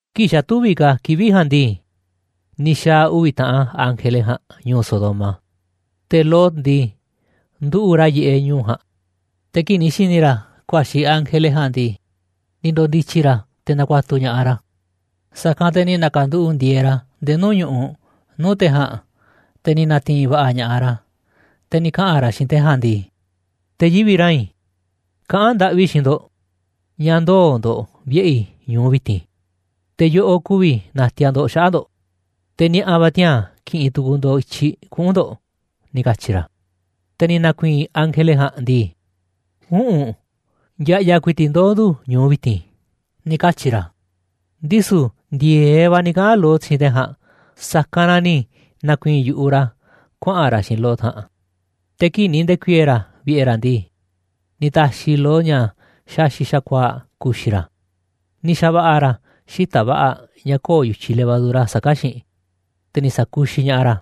Kii̱ꞌ xa̱ tüviꞌ ka̱ kivi̱ꞌ ja̱a̱nꞌ ndii, ni̱ xa̱a̱ uvi̱ taꞌan ángele ja̱a̱nꞌ ñu̱u̱ Sodoma, te̱ Lot ndii, nduꞌu̱ꞌ ra̱ yiꞌeꞌ ñu̱u̱ ja̱a̱nꞌ. Te̱ kii̱ꞌ ni̱ xi̱ni̱ ra̱ ku̱a̱xi̱ ángele ja̱a̱nꞌ ndii, ni̱ ndo̱ndi̱tyi̱ ra̱ te̱ na̱ku̱a̱tu̱ ña̱ꞌaꞌ ra̱, sa̱kanꞌ te̱ ni̱ na̱ka̱nduꞌu̱ꞌ ndi̱e̱e̱ ra̱ nde̱e̱ nuu̱ꞌ ñu̱ꞌuꞌ nuu̱ꞌ te̱ ja̱a̱nꞌ, te̱ ni̱ na̱ti̱i̱n va̱ꞌa̱ ña̱ꞌaꞌ ra̱. Te̱ ni̱ kaꞌa̱n ra̱ xiinꞌ te̱ ja̱a̱nꞌ ndii: ―Te̱ yivi̱ꞌ rain, kaꞌán ndaꞌvi i̱ xiinꞌ ndo̱ꞌ ña̱ ndoo̱ ndo̱ꞌ vi̱ꞌe̱ i̱ ñu̱u vi̱ti̱n, te̱ yoꞌoꞌ ku̱vi̱ na̱ti̱a̱ ndo̱ꞌ xaꞌa̱ꞌ ndo̱ꞌ, te̱ ni̱a̱ꞌa̱ va̱ tiaa̱n ki̱ꞌi̱n tu̱ku̱u̱ ndo̱ꞌ i̱tyiꞌ kuꞌu̱n ndo̱ꞌ ―ni̱ katyi̱ ra̱. Te̱ ni̱ na̱ku̱i̱i̱n ángele ja̱a̱nꞌ ndii: ―Üꞌu̱nꞌ, ya̱ꞌya̱ ku̱i̱ti̱ꞌ ndoo̱ ndu̱ ñu̱u vi̱ti̱n ―ni̱ katyi̱ ra̱. Ndisu̱ ndi̱e̱eꞌ va̱ ni̱ kaꞌa̱n Lot xiinꞌ te̱ ja̱a̱nꞌ, sa̱kanꞌ na ni̱ na̱ku̱i̱i̱n yu̱ꞌuꞌ ra̱ kuaꞌa̱n ra̱ xiinꞌ Lot ja̱a̱nꞌ, te̱ kii̱ꞌ ni̱ nde̱ku̱i̱e̱e̱ ra̱ vi̱ꞌe̱ ra̱ ndii, ni̱ ta̱xi̱ Lot ña̱ xaxi̱ꞌ xa̱kuaa̱ꞌ ku̱xi̱ ra̱, ni̱ xa̱va̱ꞌa̱ ra̱ xita̱ꞌ va̱ꞌa̱ ña̱ köo̱ꞌ yu̱tyiꞌ levadura saká xiinꞌ, te̱ ni̱ sa̱kuxiꞌ ña̱ꞌaꞌ ra̱.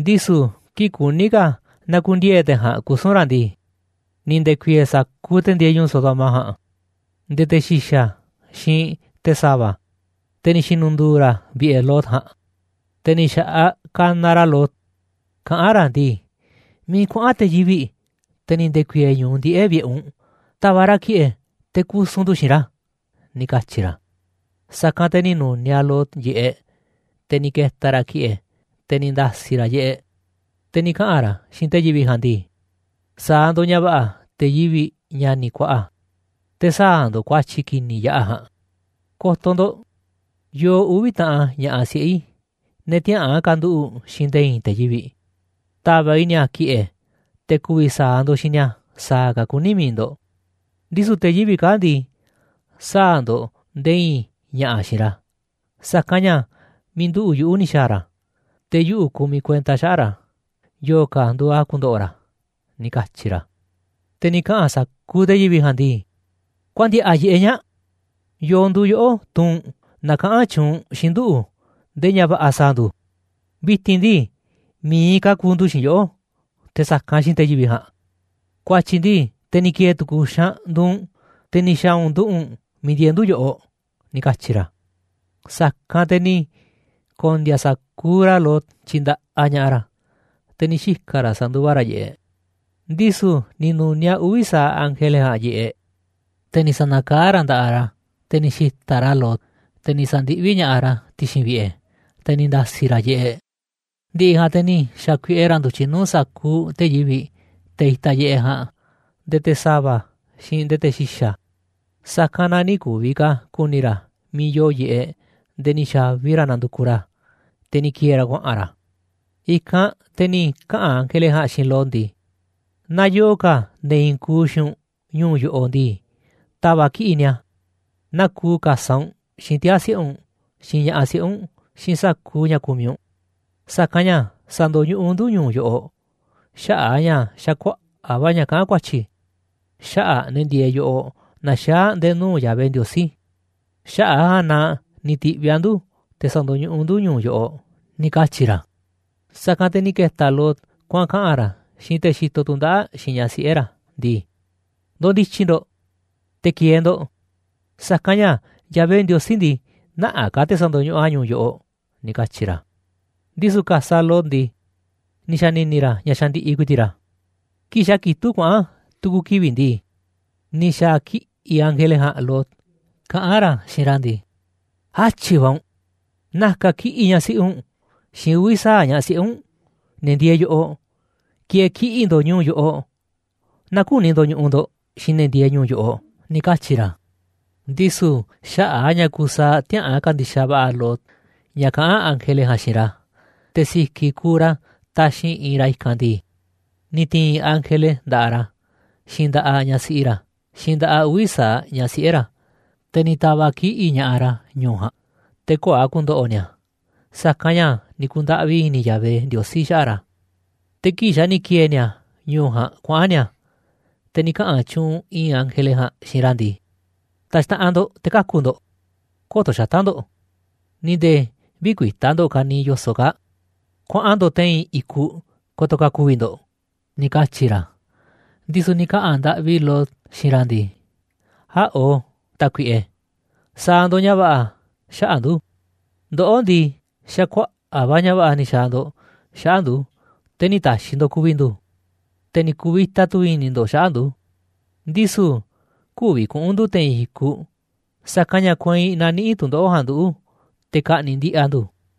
Ndisu̱ kii̱ꞌ kuní ka̱ na̱ku̱ndiee̱ te̱ ja̱a̱nꞌ kusu̱n ra̱ ndii, ni̱ nde̱ku̱i̱e̱e̱ sa̱kuuꞌ te̱ ndieeꞌ ñu̱u̱ Sodoma ja̱a̱nꞌ, nde̱e̱ te̱ xi̱xa̱, xiinꞌ te̱ sa̱va̱, te̱ ni̱ xi̱nu̱ndu̱u̱ ra̱ vi̱ꞌe̱ Lot ja̱a̱nꞌ. Te̱ ni̱ xa̱ꞌaꞌ kanaꞌ ra̱ Lot, kaꞌán ra̱ ndii: ―¿Miiꞌ kuaꞌa̱n te̱ yivi̱ꞌ, te̱ ni̱ nde̱ku̱i̱e̱e̱ ñu̱u ndiꞌe̱ꞌ vi̱ꞌe̱ u̱nꞌ, ta̱va̱ꞌ ra̱ ki̱ꞌe̱ te̱ kusu̱n ndu̱ xiinꞌ ra̱ ―ni̱ katyi̱ ra̱. Sa̱kanꞌ te̱ ni̱ nu̱niaꞌ Lot yiꞌeꞌ, te̱ ni̱ ke̱ta̱ ra̱ ki̱ꞌe̱, te̱ ni̱ nda̱si̱ ra̱ yiꞌeꞌ, te̱ ni̱ kaꞌa̱n ra̱ xiinꞌ te̱ yivi̱ꞌ ja̱a̱nꞌ ndii: ―Sa̱a̱ ndo̱ꞌ ña̱ va̱ꞌa̱, te̱ yivi̱ꞌ, ña̱ni̱ kuaꞌa, te̱ sä̱a̱ ndo̱ꞌ ku̱a̱tyi̱ ki̱ni̱ yaꞌa̱ ja̱a̱nꞌ. Ko̱to̱ ndo̱ꞌ, yoo uvi̱ taꞌan ña̱ꞌaꞌ siꞌe̱ i̱, ne̱ tiäꞌa̱an ka̱nduꞌu̱ꞌ xiinꞌ nde̱e̱ i̱i̱n te̱ yivi̱ꞌ, ta̱va̱ꞌ i̱ ni̱a̱ ki̱ꞌe̱, te̱ ku̱vi̱ sa̱a̱ ndo̱ꞌ xiinꞌ ni̱a̱ sa̱a̱ ka̱ kuní mi̱iꞌ ndo̱ꞌ, ndisu̱ te̱ yivi̱ꞌ kaa̱ꞌ ndii, sä̱a̱ ndo̱ꞌ nde̱e̱ i̱i̱n ña̱ꞌa̱ xiinꞌ ra̱, sa̱kanꞌ ña̱ miiꞌ nduꞌu̱ꞌ yuꞌu̱ ni̱ xa̱a̱ ra̱, te̱ yuꞌu̱ kumiꞌ kuenta xaꞌa̱ꞌ ra̱ yo̱o̱ ka̱ nduuꞌ a̱ ku̱ndo̱ꞌo̱ ra̱ ―ni̱ katyi̱ ra̱. Te̱ ni̱ kaꞌa̱n sa̱kuuꞌ te̱ yivi̱ꞌ ja̱a̱nꞌ ndii: ―¡Kuaꞌa̱n ndi̱a̱ꞌa̱ yiꞌeꞌ ñaa̱ꞌ! ¿Yo̱o̱ nduuꞌ yoꞌó, tuu u̱nꞌ, na kaꞌán tyuunꞌ u̱nꞌ xiinꞌ nduꞌu̱ nde̱e̱ ña̱ va̱ꞌa̱ sa̱a̱ ndu̱? Vi̱ti̱n ndii, mi̱iꞌ ka̱ ku̱u̱ ndu̱ xiinꞌ yoꞌó te̱ sa̱kanꞌ xiinꞌ te̱ yivi̱ꞌ ja̱a̱nꞌ. Ku̱a̱tyi̱ ndii, te̱ ni̱ ki̱e̱e̱ tu̱ku̱ xaanꞌ nduuꞌ u̱nꞌ, te̱ ni̱ xa̱a̱ u̱nꞌ nduꞌu̱ꞌ u̱nꞌ miiꞌ ndieeꞌ ndu̱ yoꞌoꞌ ―ni̱ katyi̱ ra̱. Sa̱kanꞌ te̱ ni̱ ko̱ndi̱a̱ sa̱kuuꞌ ra̱ Lot tyindaꞌaꞌ ña̱ꞌaꞌ ra̱, te̱ ni̱ xika̱ ra̱ sa̱nduva ra̱ yiꞌeꞌ. Ndisu̱ ni̱ nu̱niaꞌ uvi̱ sa̱aꞌ ángele ja̱a̱nꞌ yiꞌeꞌ, te̱ ni̱ sa̱na̱kaá ra̱ nda̱ꞌaꞌ ra̱, te̱ ni̱ xi̱ta̱ꞌ ra̱ Lot, te̱ ni̱ sa̱ndiꞌví ña̱ꞌaꞌ a̱ ti̱xi̱n vi̱ꞌe̱, te̱ ni̱ nda̱si̱ ra̱ yiꞌeꞌ. Ndi̱ꞌi̱ ja̱a̱nꞌ te̱ ni̱ xa̱kuiꞌe ra̱ ndu̱tyiꞌ nuu̱ꞌ sa̱kuuꞌ te̱ yivi̱ꞌ, te̱ itaꞌ yiꞌeꞌ ja̱a̱nꞌ, nde̱e̱ te̱ sa̱va̱, xiinꞌ nde̱e̱ te̱ xi̱xa̱, sa̱kanꞌ na nï̱ ku̱vi̱ ka̱ ku̱ni̱ ra̱ miiꞌ yoo yiꞌeꞌ nde̱e̱ ni̱ xa̱vi ra̱ nandukuꞌ ra̱ a̱, te̱ ni̱ ki̱e̱e̱ ra̱ kuaꞌa̱n ra̱. I̱kanꞌ te̱ ni̱ kaꞌa̱n ángele ja̱a̱nꞌ xiinꞌ Lot ndii: ―Naaꞌ yoo ka̱ ne̱ i̱i̱n kuuꞌ xiinꞌ u̱nꞌ ñu̱u̱ yoꞌoꞌ ndii, ta̱va̱ꞌ kiꞌi̱ꞌ ni̱a̱. Naa kuuꞌ ka̱saꞌ u̱nꞌ, xiinꞌ tiaa̱ siꞌe̱ u̱nꞌ, xiinꞌ ña̱ꞌaꞌ siꞌe̱ u̱nꞌ, xiinꞌ sa̱kuuꞌ ña̱ kumiꞌ u̱nꞌ, sa̱kanꞌ ña̱ sa̱ndo̱ñuꞌuꞌ ndu̱ ñu̱u̱ yoꞌoꞌ xaꞌa̱ꞌ a̱ ña̱ xa̱ kuaꞌa̱ꞌ va̱ ña̱ kaꞌán ku̱a̱tyi̱ xaꞌa̱ꞌ ne̱ ndieeꞌ yoꞌoꞌ naxaá nde̱e̱ nuu̱ꞌ Yahvé Ndiosí, xaꞌa̱ꞌ a̱ ja̱a̱nꞌ na ni̱ ti̱ꞌviꞌ a̱ ndu̱ te̱ sa̱ndo̱ñuꞌuꞌ ndu̱ ñu̱u̱ yoꞌoꞌ ―ni̱ katyi̱ ra̱. Sa̱kanꞌ te̱ ni̱ ke̱ta̱ Lot kuaꞌa̱n kaꞌa̱n ra̱ xiinꞌ te̱ xitoꞌ tu̱ndaꞌa̱ꞌ xiinꞌ ñaꞌ siꞌe̱ ra̱ ndii: ―Ndo̱ndi̱tyi̱ ndo̱ꞌ, te̱ ki̱e̱e̱ ndo̱ꞌ, sa̱kanꞌ ña̱ Yahvé Ndiosí ndii, nä̱ꞌanꞌ ka̱ te̱ sa̱ndo̱ñuꞌuꞌ a̱ ñu̱u̱ yoꞌoꞌ ―ni̱ katyi̱ ra̱. Ndisu̱ ka̱saꞌ Lot ndii, ni̱ xa̱ni̱ni̱ ra̱ ña̱ xandiꞌiꞌ ku̱i̱ti̱ꞌ ra̱. Kii̱ꞌ xa̱ kitúꞌ kuaꞌa̱n tu̱ku̱ kivi̱ꞌ ndii, ni̱ xa̱ kiꞌi̱ꞌ ángele ja̱a̱nꞌ Lot kaꞌán ra̱ xiinꞌ ra̱ ndii: ―¡Átyi̱ va̱ u̱nꞌ! Na̱ka̱ kiꞌi̱ꞌ ñaꞌ siꞌi u̱nꞌ, xiinꞌ uvi̱ sa̱aꞌ ñaꞌ siꞌe̱ u̱nꞌ, ne̱ ndieeꞌ yoꞌoꞌ, ki̱e̱e̱ kiꞌi̱ꞌ ndo̱ꞌ ñu̱u̱ yoꞌoꞌ, naaꞌ küni ndo̱ñuꞌuꞌ ndo̱ꞌ xiinꞌ ne̱ ndieeꞌ ñu̱u̱ yoꞌoꞌ ―ni̱ katyi̱ ra̱. Ndisu̱ xaꞌa̱ꞌ a̱ ña̱ kusaaꞌ tiäꞌa̱an ka̱ndi̱xaꞌ va̱ꞌa̱ Lot ña̱ kaꞌán ángele ja̱a̱nꞌ xiinꞌ ra̱, te̱ si̱ki̱ kuuꞌ ra̱ taxi̱nꞌ iinꞌ ra̱ i̱kanꞌ ndii, ni̱ ti̱i̱n ángele nda̱ꞌaꞌ ra̱, xiinꞌ nda̱ꞌaꞌ ñaꞌ siꞌi ra̱, xiinꞌ nda̱ꞌaꞌ uvi̱ sa̱aꞌ ñaꞌ siꞌe̱ ra̱, te̱ ni̱ ta̱va̱ꞌ kiꞌi̱ꞌ ña̱ꞌaꞌ ra̱ ñu̱u̱ ja̱a̱nꞌ, te̱ köo̱ꞌ a̱ ku̱ndo̱ꞌo̱ ni̱a̱, sa̱kanꞌ ña̱ ni̱ ku̱ndaꞌvi i̱ni̱ Yahvé Ndiosí xaꞌa̱ꞌ ra̱. Te̱ kii̱ꞌ xa̱ ni̱ ki̱e̱e̱ ni̱a̱ ñu̱u̱ ja̱a̱nꞌ kuaꞌa̱n ni̱a̱, te̱ ni̱ kaꞌa̱n tyuunꞌ i̱i̱n ángele ja̱a̱nꞌ xiinꞌ ra̱ ndii: ―Ta̱xtaꞌanꞌ ndo̱ꞌ te̱ kaku̱ ndo̱ꞌ, kö̱to̱ xata̱ꞌ ndo̱ꞌ, ni̱ nde̱e̱ vï̱kuita̱ ndo̱ꞌ ka̱niiꞌ yo̱soꞌ kaa̱ꞌ. Kuaꞌa̱n ndo̱ꞌ te̱i̱n i̱kuꞌ ko̱to̱ ka̱ ku̱vi̱ ndo̱ꞌ ―ni̱ katyi̱ ra̱. Ndisu̱ ni̱ kaꞌa̱n ndaꞌvi Lot xiinꞌ ra̱ ndii: ―Äꞌo̱, Tákuiꞌe, sa̱a̱ ndo̱ꞌ ña̱ va̱ꞌa̱ xaꞌa̱ꞌ ndu̱. Ndoꞌó ndii, xa̱ kuaꞌa̱ꞌ va̱ ña̱ va̱ꞌa̱ ni̱ xa̱a̱ ndo̱ꞌ xaꞌa̱ꞌ ndu̱, te̱ nï̱ ta̱xi̱ ndo̱ꞌ ku̱vi̱ ndu̱, te̱ ni̱ ku̱vi̱ta tu̱ i̱ni̱ ndo̱ꞌ xaꞌa̱ꞌ ndu̱. Ndisu̱ kü̱vi̱ kuꞌu̱n ndu̱ te̱i̱n i̱kuꞌ, sa̱kanꞌ ña̱ kueinꞌ na̱niꞌi̱ꞌ tu̱ndoꞌo̱ꞌ ja̱a̱nꞌ nduꞌu̱, te̱ ka̱ꞌni̱ꞌ ndiꞌiꞌ a̱ ndu̱.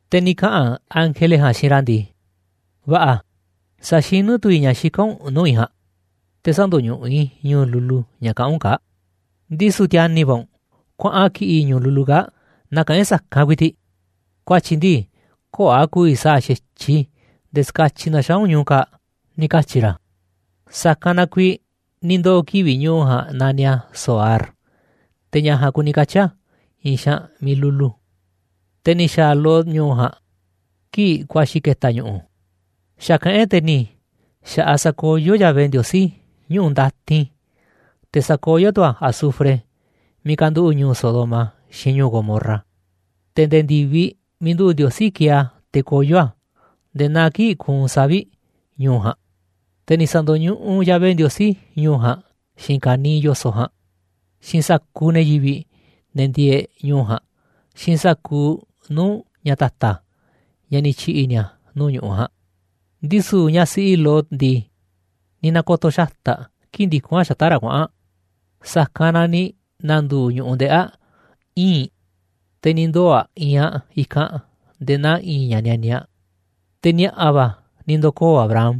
Te̱ ni̱ kaꞌa̱n ángele ja̱a̱nꞌ xiinꞌ ra̱ ndii: ―Va̱ꞌa̱, sa̱xinú tu̱ i̱ ña̱ xika̱n u̱nꞌ nuu̱ꞌ i̱ ja̱a̱nꞌ, te̱ sä̱ndo̱ñuꞌuꞌ i̱ ñu̱u̱ lulu ña̱ kaꞌán u̱nꞌ kaa̱ꞌ. Ndisu̱ ti̱a̱ni̱ va̱ u̱nꞌ, kuaꞌan kiꞌi̱ꞌ ñu̱u̱ lulu kaa̱ꞌ nakaꞌán e̱ꞌ sa̱kanꞌ ku̱i̱ti̱ꞌ, ku̱a̱tyi̱ ndii, köo̱ꞌ a̱ ku̱vi̱ sa̱a̱ xa̱tyiꞌ i̱ nde̱e̱ ska̱tyiꞌ na̱xaa̱ u̱nꞌ ñu̱u̱ kaa̱ꞌ ―ni̱ katyi̱ ra̱. Sa̱kanꞌ na kuiiꞌ ni̱ ndoo̱ kivi̱ꞌ ñu̱u̱ ja̱a̱nꞌ naniꞌ a̱ Zoar. Te̱ ña̱ ja̱a̱nꞌ kuni katyi̱ a̱ i̱i̱n xaanꞌ miiꞌ lulu. Te̱ ni̱ xa̱a̱ Lot ñu̱u̱ ja̱a̱nꞌ kii̱ꞌ ku̱a̱xi̱ ke̱ta̱ ñu̱ꞌu̱. Xa̱ kaꞌán e̱ꞌ te̱ ni̱ xa̱ꞌaꞌ sakoyó Yahvé Ndiosí ñuꞌu̱ ndatin, te̱ sakoyó tu̱ a̱ azufre miiꞌ kanduꞌu̱ꞌ ñu̱u̱ Sodoma, xiinꞌ ñu̱u̱ Gomorra, te̱ nde̱e̱ ndi̱viꞌ miiꞌ nduꞌu̱ꞌ Ndiosí kieeꞌ a̱ te̱ koyó a̱, nde̱e̱ naa kii̱ꞌ kuunꞌ savi̱ꞌ, ñu̱u̱ ja̱a̱nꞌ. Te̱ ni̱ sa̱ndo̱ñuꞌuꞌ Yahvé Ndiosí ñu̱u̱ ja̱a̱nꞌ xiinꞌ ka̱niiꞌ yo̱soꞌ ja̱a̱nꞌ, xiinꞌ sa̱kuuꞌ ne̱ yivi̱ꞌ, ne̱ ndieeꞌ ñu̱u̱ ja̱a̱nꞌ, xiinꞌ sa̱kuuꞌ nuu̱ꞌ ña̱ ta̱ta̱, ña̱ ni̱ tyi̱ꞌi̱ ni̱a̱ nuu̱ꞌ ñu̱ꞌuꞌ ja̱a̱nꞌ. Ndisu̱ ñaꞌ siꞌi Lot ndii, ni̱ na̱ko̱to̱ xata̱ꞌ aꞌ kii̱ꞌ ndikún aꞌ xata̱ꞌ ra̱ kuaꞌa̱n aꞌ, sa̱kanꞌ na ni̱ na̱ndu̱u̱ ñu̱ꞌuꞌ ndeꞌi̱ aꞌ ii̱nꞌ, te̱ ni̱ ndoo̱ aꞌ iinꞌ aꞌ i̱kanꞌ nde̱e̱ naa i̱i̱n ña̱ nianiaꞌ. Te̱ ni̱a̱ꞌa̱ va̱ ni̱ ndo̱koo̱ Abraham,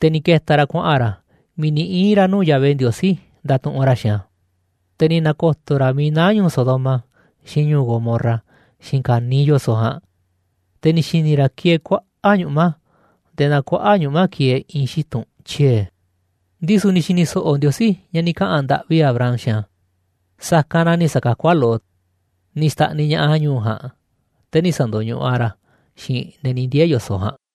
te̱ ni̱ ke̱ta̱ ra̱ kuaꞌa̱n ra̱ miiꞌ ni̱ ii̱n ra̱ nuu̱ꞌ Yahvé Ndiosí ndatuꞌunꞌ ra̱ xiinꞌ a̱. Te̱ ni̱ na̱ko̱to̱ ra̱ miiꞌ naá ñu̱u̱ Sodoma xiinꞌ ñu̱u̱ Gomorra, xiinꞌ ka̱niiꞌ yo̱soꞌ ja̱a̱nꞌ, te̱ ni̱ xi̱ni̱ ra̱ kieeꞌ kuaꞌa̱ꞌ ñuꞌma̱, nde̱e̱ naa kuaꞌa̱ꞌ ñuꞌma̱ kieeꞌ i̱i̱n xitu̱n tyie̱. Ndisu̱ ni̱ xi̱ni̱ so̱ꞌo̱ Ndiosí ña̱ ni̱ kaꞌa̱n ndaꞌvi Abraham xiinꞌ a̱, sa̱kanꞌ na ni̱ sa̱kakú a̱ Lot, ni̱ xta̱ꞌniꞌ ña̱ꞌaꞌ a̱ ñu̱u̱ ja̱a̱nꞌ, te̱ nï̱ sa̱ndo̱ñuꞌuꞌ a̱ ra̱ xiinꞌ ne̱ ni̱ ndiee̱ yo̱soꞌ ja̱a̱nꞌ.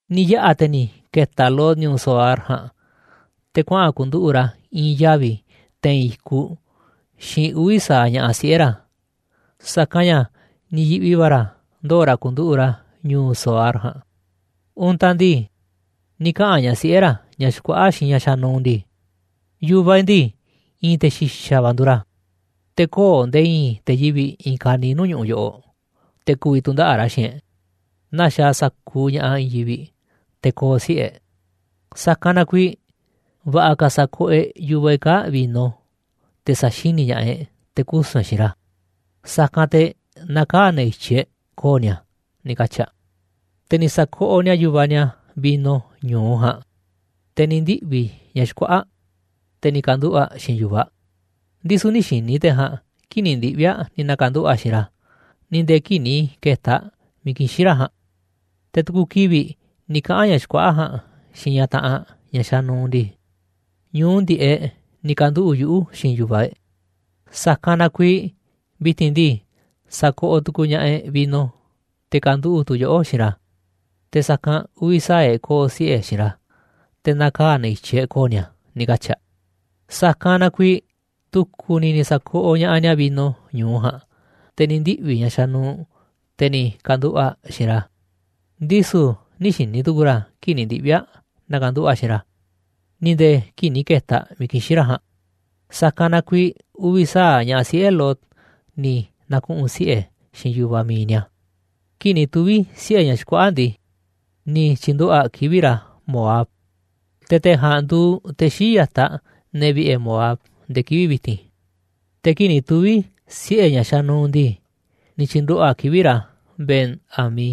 Ni̱ yaꞌa̱ te̱ ni̱ ke̱ta̱ Lot ñu̱u̱ Zoar ja̱a̱nꞌ, te̱ kuaꞌa̱n ku̱nduꞌu̱ꞌ ra̱ i̱i̱n yavi̱ te̱i̱n i̱kuꞌ xiinꞌ uvi̱ sa̱aꞌ ña̱ꞌaꞌ siꞌe̱ ra̱. Sa̱kanꞌ ña̱ ni̱ yi̱ꞌvi va̱ ra̱ ndoo̱ ra̱ ku̱nduꞌu̱ꞌ ra̱ ñu̱u̱ Zoar ja̱a̱nꞌ. Untaꞌ ndii, ni̱ kaꞌa̱n ñaꞌ siꞌe̱ ra̱, ñaꞌ xkuaꞌa̱ꞌ, xiinꞌ ñaꞌ xanuuꞌ ndii: ―Yu̱vaꞌ e̱ꞌ ndii, i̱i̱n te̱ xi̱xa̱ va̱ nduuꞌ ra̱, te̱ köo̱ꞌ nde̱e̱ i̱i̱n te̱ yivi̱ꞌ i̱i̱n ka̱niiꞌ nuu̱ꞌ ñu̱ꞌuꞌ yoꞌoꞌ te̱ ku̱vi̱ tu̱ndaꞌa̱ꞌ ra̱ xiinꞌ e̱ꞌ, naa xaaꞌ sa̱kuuꞌ ña̱ꞌaꞌ i̱i̱n yivi̱ꞌ, te̱ ko̱o̱ siꞌe̱ e̱ꞌ. Sa̱kanꞌ na kuiiꞌ, va̱ꞌa̱ ka̱ sa̱koꞌoꞌ e̱ꞌ yu̱vaꞌ e̱ꞌ kaa̱ꞌ vino, te̱ sa̱xini̱ ña̱ꞌaꞌ e̱ꞌ te̱ kusu̱n e̱ꞌ xiinꞌ ra̱, sa̱kanꞌ te̱ na̱kaa̱ ne̱ i̱tyiꞌ e̱ꞌ ko̱o̱ ni̱a̱ ―ni̱ katyi̱ aꞌ. Te̱ ni̱ sa̱koꞌoꞌ ni̱a̱ yu̱vaꞌ ni̱a̱ vino ñu̱u ja̱a̱nꞌ, te̱ ni̱ ndiꞌvi̱ ñaꞌ xkuaꞌa̱ꞌ, te̱ ni̱ ka̱nduꞌu̱ꞌ aꞌ xiinꞌ yu̱vaꞌ aꞌ. Ndisu̱ nï̱ xi̱ni̱ te̱ ja̱a̱nꞌ kii̱ꞌ ni̱ ndiꞌvi̱ aꞌ ni̱ na̱ka̱nduꞌu̱ꞌ aꞌ xiinꞌ ra̱, ni̱ nde̱e̱ kii̱ꞌ ni̱ ke̱ta̱ aꞌ miiꞌ kixín ra̱ ja̱a̱nꞌ. Te̱ tu̱ku̱ kivi̱ꞌ ni̱ kaꞌa̱n ñaꞌ xkuaꞌa̱ꞌ ja̱a̱nꞌ xiinꞌ ñaꞌ taꞌanꞌ aꞌ, ñaꞌ xanuuꞌ ndii: ―Ñu̱u ndiꞌe̱ꞌ ni̱ ka̱nduꞌu̱ꞌ yuꞌu̱ xiinꞌ yu̱vaꞌ e̱ꞌ, sa̱kanꞌ na kuiiꞌ vi̱ti̱n ndii, sa̱koꞌoꞌ tu̱ku̱u̱ ña̱ꞌaꞌ e̱ꞌ vino, te̱ ka̱nduꞌu̱ꞌ tu̱ yoꞌó xiinꞌ ra̱, te̱ sa̱kanꞌ uvi̱ sa̱aꞌ e̱ꞌ ko̱o̱ siꞌe̱ xiinꞌ ra̱, te̱ na̱kaa̱ ne̱ i̱tyiꞌ e̱ꞌ ko̱o̱ ni̱a̱ ―ni̱ katyi̱ aꞌ. Sa̱kanꞌ na kuiiꞌ tu̱ku̱ ni̱ ni̱ sa̱koꞌoꞌ ña̱ꞌaꞌ ni̱a̱ vino ñu̱u ja̱a̱nꞌ, te̱ ni̱ ndiꞌvi̱ ñaꞌ xanuuꞌ, te̱ ni̱ ka̱nduꞌu̱ꞌ aꞌ xiinꞌ ra̱. Ndisu̱ nï̱ xi̱ni̱ tu̱ku̱u̱ ra̱ kii̱ꞌ ni̱ ndiꞌvi̱ aꞌ na̱ka̱nduꞌu̱ꞌ aꞌ xiinꞌ ra̱, ni̱ nde̱e̱ kii̱ꞌ ni̱ ke̱ta̱ aꞌ miiꞌ kixín ra̱ ja̱a̱nꞌ. Sa̱kanꞌ na kuiiꞌ uvi̱ sa̱aꞌ ñaꞌ siꞌe̱ Lot ni̱ na̱kuꞌu̱n siꞌe̱ xiinꞌ yu̱vaꞌ mi̱iꞌ ni̱a̱. Kii̱ꞌ ni̱ tuvi̱ siꞌe̱ ñaꞌ xkuaꞌa̱ꞌ ndii, ni̱ tyi̱nduꞌu̱ꞌ aꞌ kivi̱ꞌ ra̱ Moab, te̱ te̱ ja̱a̱nꞌ nduuꞌ te̱ xii̱ꞌ ya̱taꞌ ne̱ vi̱ꞌe̱ Moab nde̱e̱ kivi̱ꞌ vi̱ti̱n. Te̱ kii̱ꞌ ni̱ tuvi̱ siꞌe̱ ñaꞌ xanuuꞌ ndii, ni̱ tyi̱nduꞌu̱ꞌ aꞌ kivi̱ꞌ ra̱ Ben-ammi,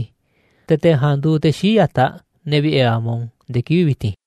te̱ te̱ ja̱a̱nꞌ nduuꞌ te̱ xii̱ꞌ ya̱taꞌ ne̱ vi̱ꞌe̱ Amon nde̱e̱ kivi̱ꞌ vi̱ti̱n.